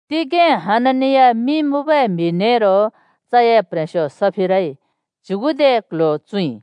तिगें हननिया मिं मुँबै म्हि नेरो चए प्ह्रेंस्यो सफिराइ च्युगुदे क्ल्ह्‍यो चुँइ,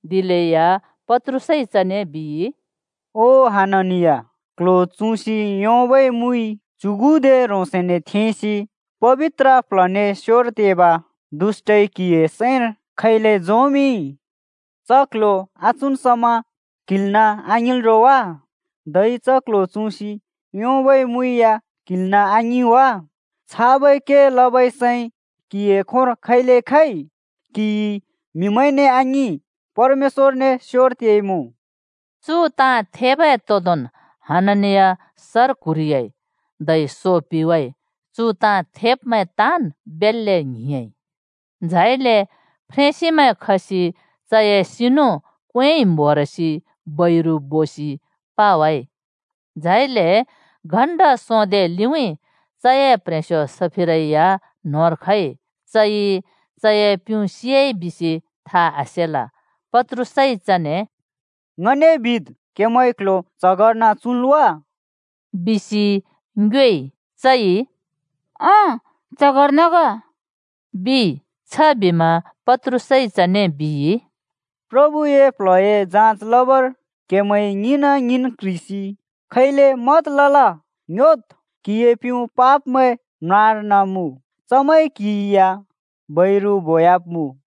दिलेया पत्रुसइ चने बिइ, “ओ हननिया, क्ल्ह्‍यो चुँसि योंबै मुइ च्युगुदे ह्रोंसने थेंसि पबित्र प्ल्हने स्योर तेब दुष्‍टइ क्हिए सैंर खैले झोंमिंइ? च क्ल्ह्‍यो आचुँन् समा क्हिल्‍नाँ आङिंल् रो वा? धै च क्ल्ह्‍यो चुँसि योंबै मुइ या क्हिल्‍नाँ आङिं वा? छाबै के लबै सैं क्हिए खोंर खैले खइ? क्हिइ म्हिमैंने आङिं परमेश्‍व‍रने स्योर तेइमुँ।” चु ताँ थेबै तोंदोंन् हननिया सर क्हुरिह्‍याइ धै सो पिवाइ। चु ताँ थेब्मैं ताँन् बेल्‍ले ङ्हिंयाँइ। झाइले फ्रेंसिमैं खसि चए सिनु क्वेंइ म्होरसि बैरु बोसि पावाइ। झाइले घण्‍टा सोंदे लिउँइँ चए प्ह्रेंस्यो सफिरै या न्होंर खइ। चइ चए प्युँ सियाइ बिसि था आसेल। पत्रुसइ चने “ङने बिद्, क्‍हेमैंइ क्ल्ह्‍यो च्हगर्न चुँल् वा?” बिसि ङ्योएइ। चइ “ओं, च्‍हगर्न ग,” बिइ। छबिमा पत्रुसइ चने बिइ, “प्रभुए प्ल्हए जाँच लबर क्‍हेमैं ङ्हिंना-ङ्हिंन् क्ह्रिसि खैले मत लल? ङ्‍ह्‍योद्! क्हिए प्युँ पाब्मैं म्रार्न मुँ। चमैंइ क्हि या बैरु बोयाब्मुँ।”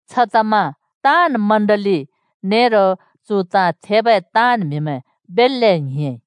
छतमा ताँन् चर्च नेरो चु ताँ थेबै ताँन् म्हिमैं बेल्‍ले ङ्हिंयाँइ।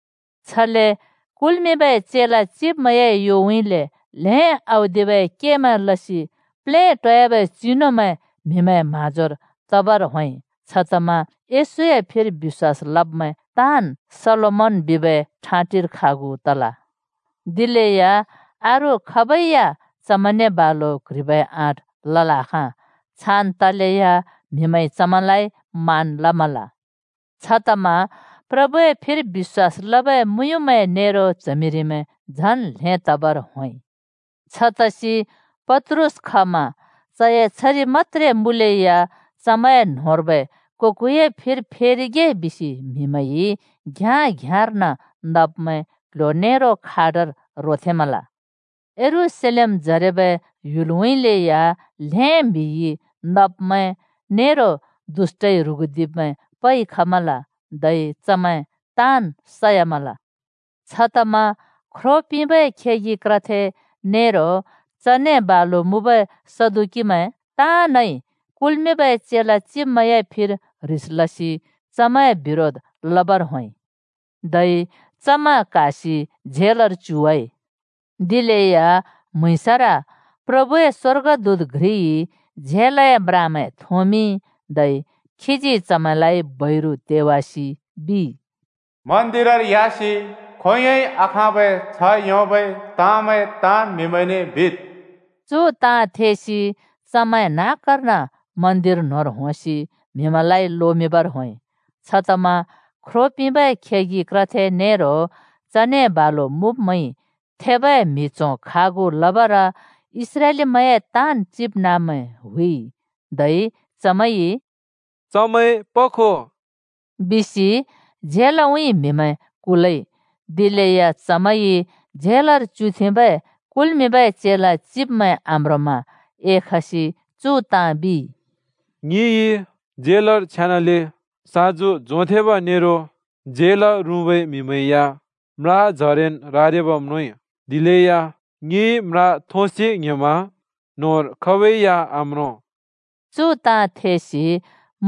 छले कुल्मिंबै चेला चिब्मैंए योउँइँले ल्हें औदिबै केमैं लसि प्लेटोयाबै चिनुमैं म्हिमैंए म्हाँजोर तबर होंइ। छतमा येशूए फिर बिश्‍वास लब्मैं ताँन् सोलोमन बिबै ठाँटिर खागु तल। दिलेया अरू खाबै या चमैंने बालु क्ह्रिबै आँट लल् आखाँ। छान् तलेया म्हिमैंइ चमैंलाइ मान लमल। छतमा प्रभुए फिर बिश्‍वास लबै मुँयुँमैं नेरो च्हमिरिमैं झन् ल्हें तबर होंइ। छतसि पत्रुस खमा चए छरि मत्‍त्रे मुँलेया चमैंए न्होंर्बै को-कोए फिर फेरिगे बिसि म्हिमैंइ घ्याँ-घ्याँर्न नब्मैं क्ल्ह्‍यो नेरो खाटर रोथेंमल। यरूशलेमजरेबै ह्‍युलउँइँले या ल्हें म्हिइ नब्मैं, नेरो दुष्‍टइ ह्रुगुदिब्मैं पइ खमल, धै चमैं ताँन् सयामल। छतमा ख्रो पिंबै खेगि क्रथे नेरो चने बालु मुँबै सदुकीमैं ताँनइ कुल्मिंबै चेला चिब्मैंए फिर ह्रिस लसि चमैंए बिरोध लबर होंइ। धै चमैं क्हासि झेलर च्युवाइ। दिलेया म्‍हुँइँसर प्रभुए स्वर्गदूत घ्रिइ झेलए म्रामैं थोंमिंइ, धै खीजी चमैंलाइ बैरु तेवासि बिइ, “मन्दिरर ह्‍यासि खोंयोंन् बिलै आखाँबै छ्ह योंबै ताँमैं ताँन् म्हिमैंने बिद्।” चु ताँ थेसि चमैं न्हाँकार्न मन्दिर न्होंर होंसि म्हिमैंलाइ लोमिंबर होंइ। छतमा ख्रो पिंबै खेगि क्रथे नेरो चने बालु मुँब्मैंइ थेबै म्हि च्हों खागु लबर इस्रालिमैंए ताँन् चिबनाँब्मैं हुइइ। धै चमैंइ “चमैं पखो” बिसि झेलउँइँ म्हिमैं कुलइ। दिलेया चमैंइ झेलर च्युथेंबै कुल्मिंबै चेला चिब्मैं आम्रोंमा एखसि चु ताँ बिइ, “ङिइ झेलर छेनाले साँजु झोंथेंब नेरो झेल रुँबै म्हिमैं या म्राजरेन् रारिबा म्रोंइ, दिलेया ङिइ म्रा थोंसि ङ्ह्‍योमा न्होंर खाबै या आम्रों!” चु ताँ थेसि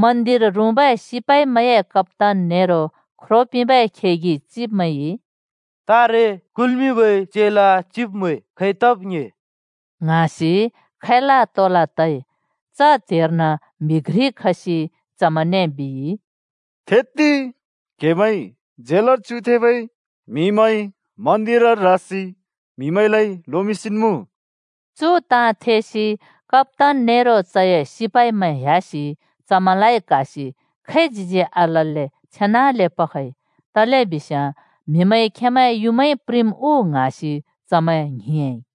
मन्दिर रुँबै सिपाइमैंए कप्‍तान नेरो ख्रो पिंबै खेगि चिब्मैंइ, “तारे कुल्मिंबै चेला चिब्मैं खै तब् ङ्‍हे” ङ्हाँसि खैला तोला तइ। च त्हेर्न म्हि घ्रि खसि चमैंने बिइ, “थेत्ति, क्हेमैंइ झेलर च्युथेंबै म्हिमैं मन्दिरर रासि म्हिमैंलाइ लोमिंसिन् मुँ!” चु ताँ थेसि कप्‍तान नेरो चए सिपाइमैं ह्‍यासि चमैंलाइ क्हासि खैच्हिजी आलल्‍ले छेनाले पखइ, तलेबिस्याँ म्हिमैंइ खेंमैं युँमाइ प्रिंम् उ ङ्हाँसि चमैं ङ्हिंयाँइ।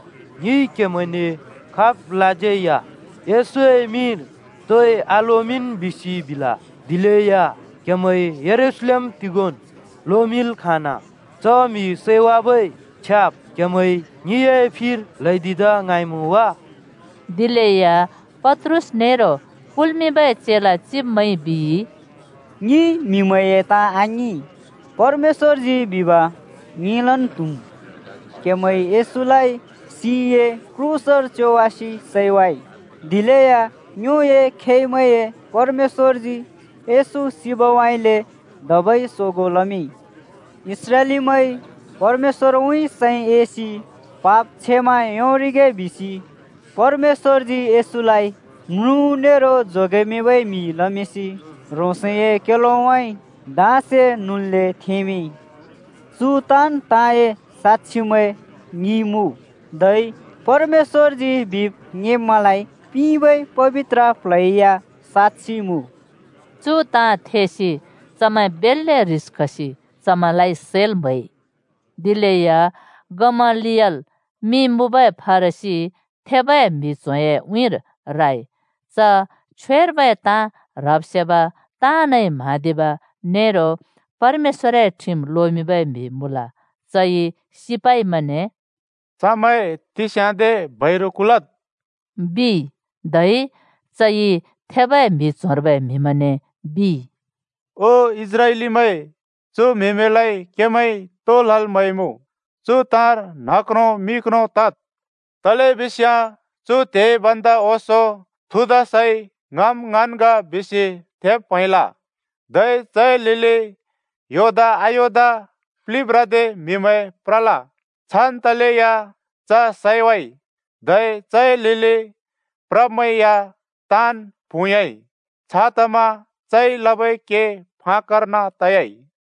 “ङिइ क्हेमैंने खाबलाज्यै येशूए मिंर तोइ आलोमिंन् बिसि बिल, दिलेया क्हेमैंइ यरूशलेम तिगोंन् लोमिंल् खाँना। च म्हि सैवाबै छ्याब् क्हेमैइ ङिए फिर ल्हैदिदा ङ्हाँइमुँ वा?” दिलेया पत्रुस नेरो कुल्मिंबै चेला चिब्मैंइ बिइ, “ङिइ म्हिमैंए ताँ आङिं, परमेश्‍वरजी बिब ङिंलन् त्हुम्। क्हेमैंइ यशूलाइ सिए क्रूसर च्योवासि सैवाइ। दिलेया ङ्योए खेंमैंए परमेश्‍वरजी येशू सिबउँइँले धबै सोगों लमिंइ। इस्राएलीमैंइ परमेश्‍वरउँइँ सैं एसि पाप क्षमा योंरिगे बिसि परमेश्‍वरजी येशूलाइ म्रुँ नेरो जोगेमिंबै म्हि लमिंसि ह्रोंसए क्योलोउँइँ धाँसे नुल्‍ले थेंमिंइ। चु ताँन् ताँए साँक्षिमैं ङि मुँ, धै परमेश्‍वरजी बिब् ङिंब्मैंलाइ पिंबै पबित्र प्ल्ह या साँक्षि मुँ।” चु ताँ थेसि चमैं बेल्‍ले ह्रिस खसि चमैंलाइ सैल् म्हैइ। दिलेया गमलियल मिं मुँबै फरिसी थेबै म्हि च्होंए उँइँर राइ। च छ्वेर्बै ताँ ह्रब् सेब, ताँनइ म्हाँदिब, नेरो परमेश्‍वरए ठिम लोमिंबै म्हि मुँल। चइ सिपाइमैंने “चमैं तिस्याँदे बैरु कुलद्,” बिइ। धै चइ थेबै म्हि च्होंर्बै म्हिमैंने बिइ, “ओ इस्राएलीमैं, चु म्हिमैंलाइ क्हेमैंइ तो लल् म्हैमुँ, चु ताँर न्ह क्रों मि क्रों तद्। तलेबिस्याँ चु त्हे भन्दा ओंसों थुदासइ ङम् ङन् ग बिसि थेब् प्हैंल, धै चए लिलि योदा-अयोदा प्लिब्रादे म्हिमैं प्रल। छान् तलेया च सैवाइ, धै चए लिलि प्रब्मैं या ताँन् प्हुँयाँइ। छतमा चइ लबै के फाक्‍कर्न तयाइ।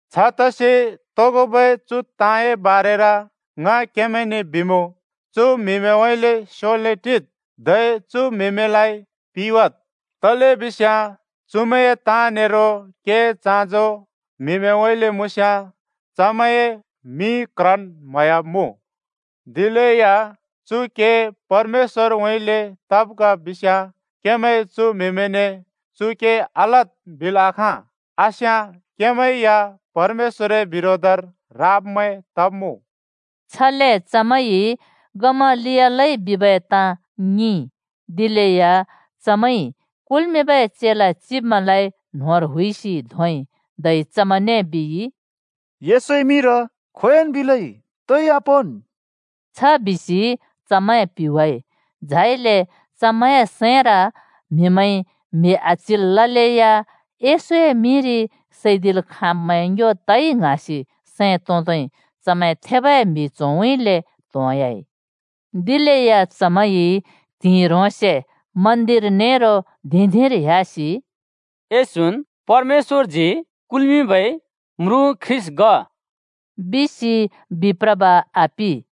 छतसि तोगोबै चु ताँए बारेर ङ क्हेमैंने बिमुँ, चु म्हिमैंउँइँले स्योले टिद्, धै चु म्हिमैंलाइ पिवाद्। तलेबिस्याँ चुमैंए ताँ नेरो केए चाँजो म्हिमैंउँइँले मुँस्याँ चमैंए मिं क्रन् म्हयाब्मुँ। दिलेया चु के परमेश्‍वरउँइँले तब् ग बिस्याँ क्हेमैंइ चु म्हिमैंने ‘चु के आलद्’ बिल् आखाँ। आस्याँ क्हेमैं या परमेश्‍वरए बिरोधर राब्मैं तब्मुँ।” छले चमैंइ गमलियलइ बिबै ताँ ङिंइ, दिलेया चमैंइ कुल्मिंबै चेला चिब्मैंलाइ न्होंर हुइसि धोंइ, धै चमैंने बिइ, “येशूए मिंर खोंयोंन् बिलै तोइ आपोंन्!” छ बिसि चमैं पिवाइ। झाइले चमैंए सैंर, म्हिमैंइ म्हि आच्जिल् ललेया येशूए मिंरि सैदिल् खाँब्मैं ङ्यो तइ ङ्हाँसि सैं तोंदै चमैं थेबै म्हि च्होंउँइँले त्होंह्‍याइ। दिलेया चमैंइ त्हिंइ ह्रोंसे मन्दिर नेरो धिं-धिंर ह्‍यासि “येशून् परमेश्‍वरजी कुल्मिंबै म्रुँ ख्रीष्‍ट ग” बिसि बिप्रब आपि।